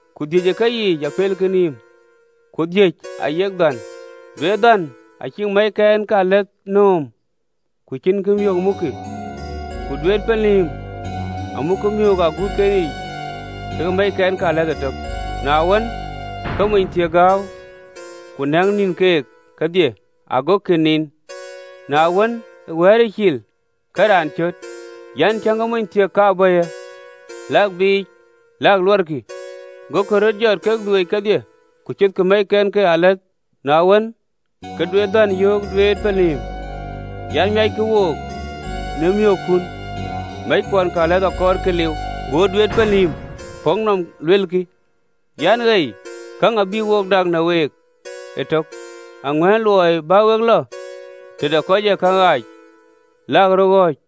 Ku dhïc ë keyiic apelkï nïïm, ku dhïc ayek dhän. Duet dhän acïk mɛ̈ckɛnkealath nööm, ku cïn miök mukkï, ku duet pelnïïm amukkï miöök ë aguutken yiic kekë mɛ̈ckɛnkealath ëtök. Na wën, ke monythiëk gääu, ku näk nïn keek kedhie, agokï niin. Na wën, ë wɛ̈ɛ̈ric cil, ke raan cöt an, ‘Tiëŋkï, monythiëk ka bɔ̈yë! Lakï biic lak luɔɔrkï.’ Gokï röt jɔt kek dhueec kedhie, ku cothkï mɛ̈ckɛnkealath. Na wën, ke duet dhän yöök duet pelnïïm an, ‘Miackï wook në miöökkun, mɛ̈ckuɔnkealath akɔɔrkï liu.’ Go duet pelnïïm puk nɔm, luelkï an, ‘Ei, käŋ abïk wo dak në week ëtök, aŋuän luɔi bä we lɔ tëde kɔc ë käŋ ɣaac, lak röt ɣɔ̈ɔ̈c.’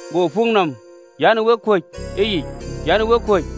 Go puk nɔm an, ‘Wek yɔ̈ɔ̈k ëyic, wek kuöc.’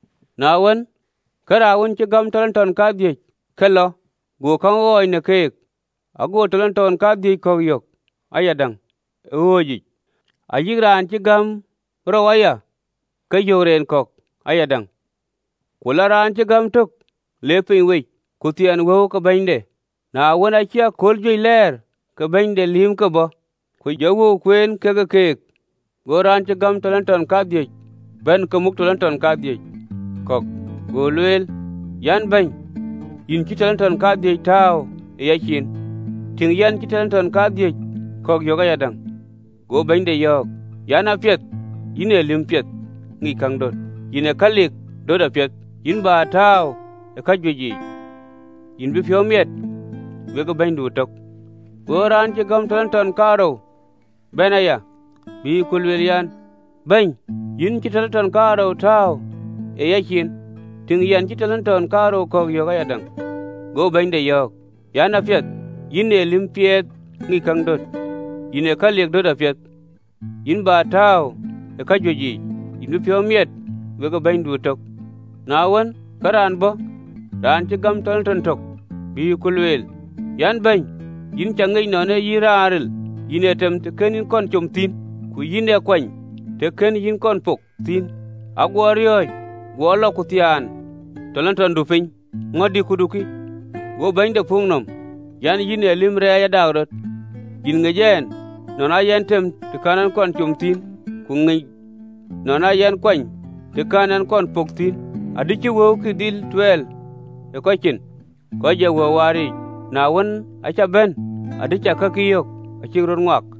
Na wën, ke raan wën cï gäm aguum kadhïc, ke lɔ, go käŋ ɣɔɔc në keek, ago aguum kadhïc ke wëu kɔ̈k yök ayadäŋ ë ɣööcic. Ayï raan cï gäm rou aya, ke yök ren kɔ̈k ayadäŋ. Ku lɔ raan cï gäm tök, le piny wec, ku thiɛɛn wëu ke bɛ̈nyde. Na wën, aacï akööl juëc lɛɛr, ke bɛ̈ny de lïïmke bɔ̈, ku jɔ wëu kueen kekë keek. Go raan cï gäm aguum kadhïc ke wëu bɛ̈n ke muk aguum kadhïc kɔ̈k, go lueel an, ‘Bɛ̈ny, yïn cï aguum kadhïc ke wëu tääu ë yacin, tïŋ, yɛn cï aguum kadhïc kɔ̈k yök ayadäŋ.’ Go bɛ̈nyde yɔ̈ɔ̈k an, ‘Apiɛth, yïn ee lïm piɛth ŋic käŋ döt, yïn ë kalik döt apiɛth, yïn bä tääu ë kajuëc yiic, yïn bï piɔ̈u miɛt wekë bɛ̈nydu ëtök.’ Go raan cï gäm aguum kaarou ke wëu bɛ̈n aya, bï ku lueel an, ‘Bɛ̈ny, yïn cï aguum kaarou ke wëu tääu ë yacin, tïŋ, yɛn cï aguum kaarou ke wëu kɔ̈k yök ayadäŋ.’ Go bɛ̈nyde yɔ̈ɔ̈k an, ‘Apiɛth, yïn ee lïm piɛth ŋic käŋ döt, yïn ë kalik döt apiɛth, yïn bä tääu ë kajuëc yiic, yïn bï piɔ̈u miɛt wekë bɛ̈nydu ëtök!’ Na wën, ke raan bɔ̈ raan cï gäm agum töŋ de wëu, bï ku lueel an, ‘Bɛ̈ny, yïn cä ŋic nɔn ee yïn raan ril, yïn ee tem të kën yïn kɔn com thïn, ku yïn ee kuany të kën yïn kɔn pok thïn, aguɔ riɔ̈ɔ̈c, guɔ lɔ ku thiaan agumdu piny, ŋö dï, këdu kï.’ Go bɛ̈nyde puk nɔm an, “Yïn ee lïm rɛɛc adaakrɔt, yïn ŋic ɛn nɔn aa yɛn tem të kɛ̈n ɛn com thïn, ku ŋic nɔn aa yɛn kuany të kɛ̈n ɛn kɔn pok thïn, adï cï wëukï dhil tuɛɛl ë kɔc cin kɔc ë wëu waar yiic, na miäk, aa cä bɛ̈n, adï cä kakï yök acïk röt ŋuak.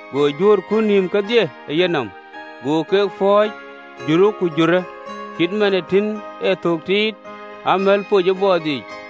go juöör kut nïïm kedhie ë yenɔm, go ke pɔ̈ɔ̈c, jurë ku jurë, cït man ë tïn ë thök tiit ee amɛ̈l poc ë bɔɔth yiic.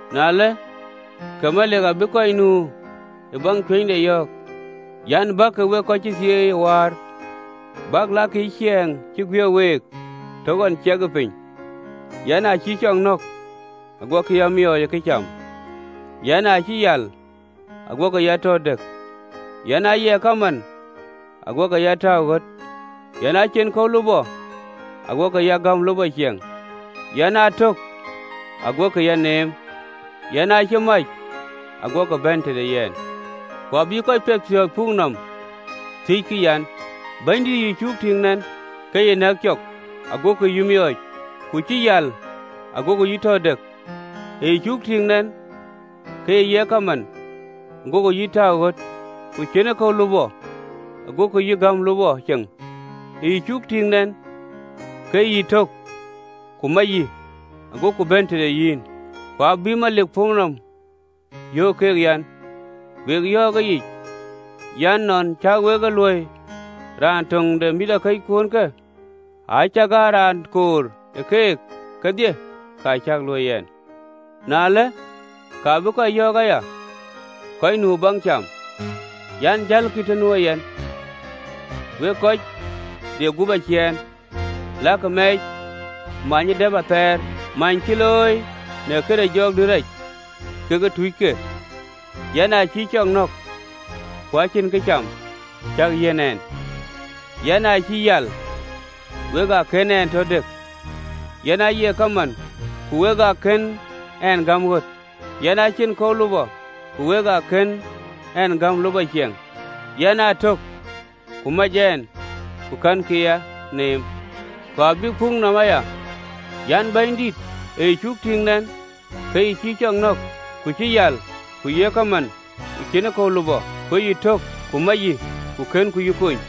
Na ëlë, ke Melik abï kɔc nu ë baŋ cuënyde yɔ̈ɔ̈k an, “Bäkï, wek kɔc cï thieei ë wäär, bäk lakkï ciɛɛŋ cï guiëk week të ɣɔn ciɛkë piny, yɛn aa cïï cɔk nɔ̈k, aguɔkï a miɔɔc ë këcam, yɛn aa cï yal, aguɔkï ya tɔ dëk, yɛn aaye kaman, aguɔkï ya tääu ɣöt, yɛn aa cïn kɔ̈u lupɔ, aguɔkï ya gäm lupɔ ciɛŋ, yɛn aa tök, aguɔkï ya neem, yɛn aa cï mac, aguɔkï bɛ̈n tëde yɛn.’ Ku abï kɔc piɛthpiɔ̈ɔ̈th puk nɔm, thiëckï an, ‘Bɛ̈nydït, ë yï cuk tïŋ nɛn, ke yï nɛ̈k cɔk, agoku yï miɔɔc? Ku cï yal, agoku yï tɔ dëk? Ë yï cuk tïŋ nɛn ke yï ye kaman, agoku yï tääu ɣöt? Ku cïnë kɔ̈u lupɔ, agoku yï gäm lupɔ ceŋ? Ë yï cuk tïŋ nɛn ke yï tök, ku mac yï, agoku bɛ̈n të nu yïn?’ Ku abï melik puk nɔm, yöök keek an, ‘Wek yɔ̈ɔ̈k ëyic an, Nɔn cä wek e luöi raan töŋ de mïthëkɔckuɔnkë, acakaa raan koor ë keek kedhie, ka cäk luöi yɛn!’ Na ëlë, ka bï kɔc yɔ̈ɔ̈k aya kɔc nu ë baŋ cam an, ‘Jälkï të nuö yɛn, wek kɔc de gup aciɛɛn, lakï mɛɛc, many ë dëp athɛɛr, many cï looi në këde jɔŋdït rac kekë tuucke! Yɛn aa cïï cɔk nɔ̈k, ku acïn këcam cäk yiɛ̈n ɛn, yɛn aa cï yal, ku wek ë kën ɛn tɔ dëk, yɛn aaye kaman, ku wek ë kën ɛn gäm ɣöt, yɛn aa cïn kɔ̈u lupɔ, ku wek ë kën ɛn gäm lupɔ ciɛŋ, yɛn aa tök, ku kɛ̈nkï ya neem.’ Ku abïk puk nɔm aya an, ‘Bɛ̈nydït, ë yï cuk tïŋ nɛn ke yï cï cɔk nɔ̈k, ku cï yal, ku ye kaman, ku cïnë kɔ̈u lupɔ, ku tök yïn, ku mac yï, ku kënku yï kony?’